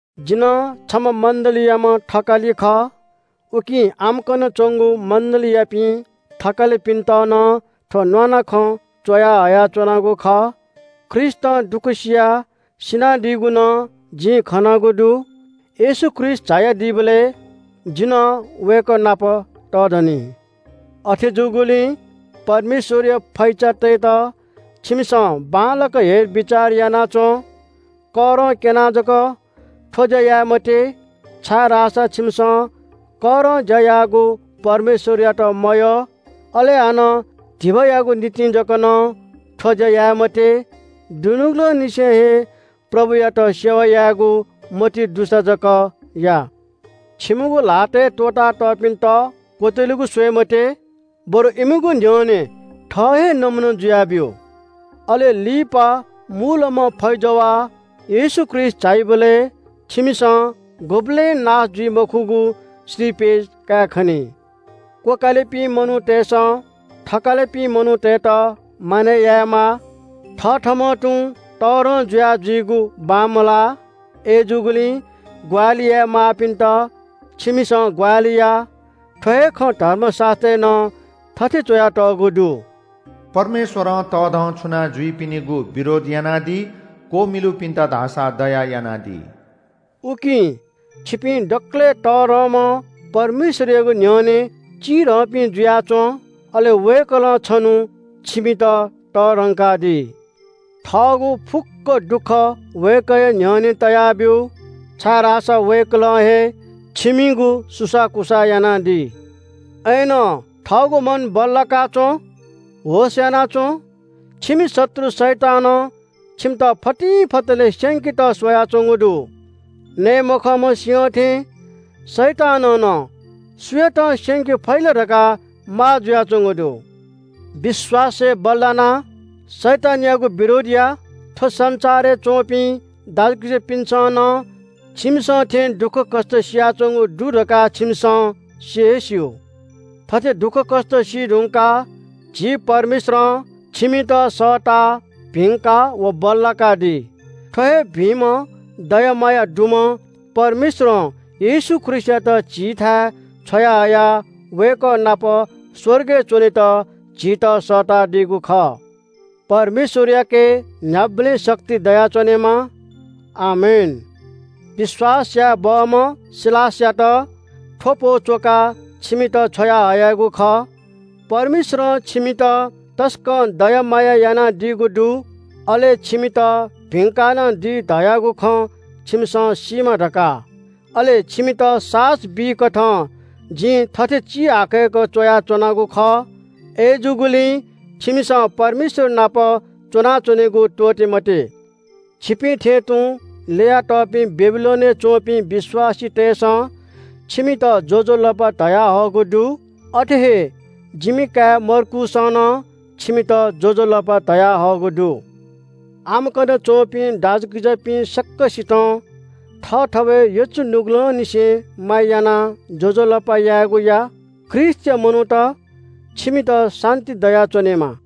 जि नं छम्‍ह मण्‍डलीयाम्‍ह थकालि खः। उकिं आम्‍कन च्‍वंगु मण्‍डलीयापिं थकालिपिन्‍त नं थ्‍व न्‍वानाखँ च्‍वया हयाच्‍वनागु खः। ख्रीष्‍टं दुःख सियाः सिनादीगु नं जिं खनागु दु। येशू ख्रीष्‍ट झायादीबलय् जि नं वय्‌कः नाप तःधनी। अथे जूगुलिं परमेश्‍वरया फैचातय्‌त छिमिसं बांलाक हेरबिचार याना च्‍वँ। करं क्‍यनाः जक थ्‍व ज्‍या याये मते, छाय्‌धाःसा छिमिसं करं ज्‍या याःगु परमेश्‍वरयात मयः। अले हानं धिबायागु निंतिं जक नं थ्‍व ज्‍या याये मते। दुनुगलंनिसें हे प्रभुयात सेवा यायेगु मतिइ दुसा जक या। छिमिगु ल्‍हातय् त्‍वःता तःपिन्‍त क्‍वत्‍यलेगु स्‍वये मते, बरु इमिगु न्‍ह्यःने थः हे नमूना जुयाब्‍यु। अले लिपा मूलम्‍ह फैजवाः येशू ख्रीष्‍ट झाइबलय् छिमिसं गुबलें नाश जुइ मखुगु श्रीपेच कायेखनी। क्‍वकालिपिं मनूतय्‌सं थकालिपिं मनूतय्‌त मानय् यायेमाः। थथःम्‍हं तुं तःधं जुया जुइगु बांमलाः। अय्‌जूगुलिं ग्‍वाहालि याये माःपिन्‍त छिमिसं ग्‍वाहालि या। थ्‍व हे खँ धर्मशास्‍त्रय् नं थथे च्‍वयातःगु दु – “परमेश्‍वरं तःधंछुना जुइपिनिगु विरोध यानादी, क्‍वमिलुपिन्‍त धाःसा दया यानादी।” उकिं छिपिं दकलय् तःधंम्‍ह परमेश्‍वरयागु न्‍ह्यःने चिधंपिं जुयाः च्‍वँ। अले वय्‌कलं छन्‍हु छिमित तःधंकादी। थःगु फुक्‍क दुःख वय्‌कःया न्‍ह्यःने तयाब्‍यु, छाय्‌धाःसा वय्‌कलं हे छिमिगु सुसाःकुसाः यानादी। अय्‌नं थःगु मन बल्‍लाका च्‍वँ, होश‍ यानाच्‍वँ। छिमि शत्रु, शैतानं छिमित फतिंफतलय् स्‍यंकेत स्‍वयाच्‍वंगु दु। नये मखंम्‍ह सिंह थें शैतानं नं सुयातं स्‍यंके फइ ला धकाः माः जुयाच्‍वंगु दु। विश्‍वासय् बल्‍लानाः शैतानयागु विरोध या। थ्‍व संसारय् च्‍वंपिं दाजुकिजापिन्‍सं नं छिमिसं थें दुःखकष्‍ट सियाच्‍वंगु दु धकाः छिमिसं सि हे स्‍यू। थथे दुःखकष्‍ट सीधुंकाः झी परमेश्‍वरं छिमित सःताः भिंका व बल्‍लाकादी। थ्‍व हे भिंम्‍ह दया माया दुम्‍ह परमेश्‍वरं येशू ख्रीष्‍टयात झीथाय् छ्वयाहयाः वय्‌कः नाप स्‍वर्गय् च्‍वनेत झीत सःतादीगु खः। परमेश्‍वरयाके न्‍ह्याबलें शक्ति दयाच्‍वनेमा। आमेन। विश्‍वास याये बहःम्‍ह सिलासयात थ्‍व पौ च्‍वकाः छिमित छ्वयाहयागु खः। परमेश्‍वरं छिमित तसकं दया माया यानादीगु दु, अले छिमित भिंका नं दी धयागु खँ छिमिसं सीमा धकाः, अले छिमित साहस बीकथं जिं थथे चिहाकय्‌क च्‍वयाच्‍वनागु खः। अय्‌जूगुलिं छिमिसं परमेश्‍वर नाप च्‍वनाच्‍वनेगु त्‍वःते मते। छिपिं थें तुं ल्‍ययातःपिं बेबिलोनय् च्‍वंपिं विश्‍वासीतय्‌सं छिमित ज्‍वजलपा धयाहःगु दु। अथे हे जिमि काय् मर्कूसं नं छिमित ज्‍वजलपा धयाहःगु दु। आम्‍कन च्‍वंपिं दाजुकिजापिं सकसितं थःथवय् यचु नुगलंनिसें माया यानाः ज्‍वजलपा यायेगु या। ख्रीष्‍टया मनूत, छिमित शान्‍ति दयाच्‍वनेमा।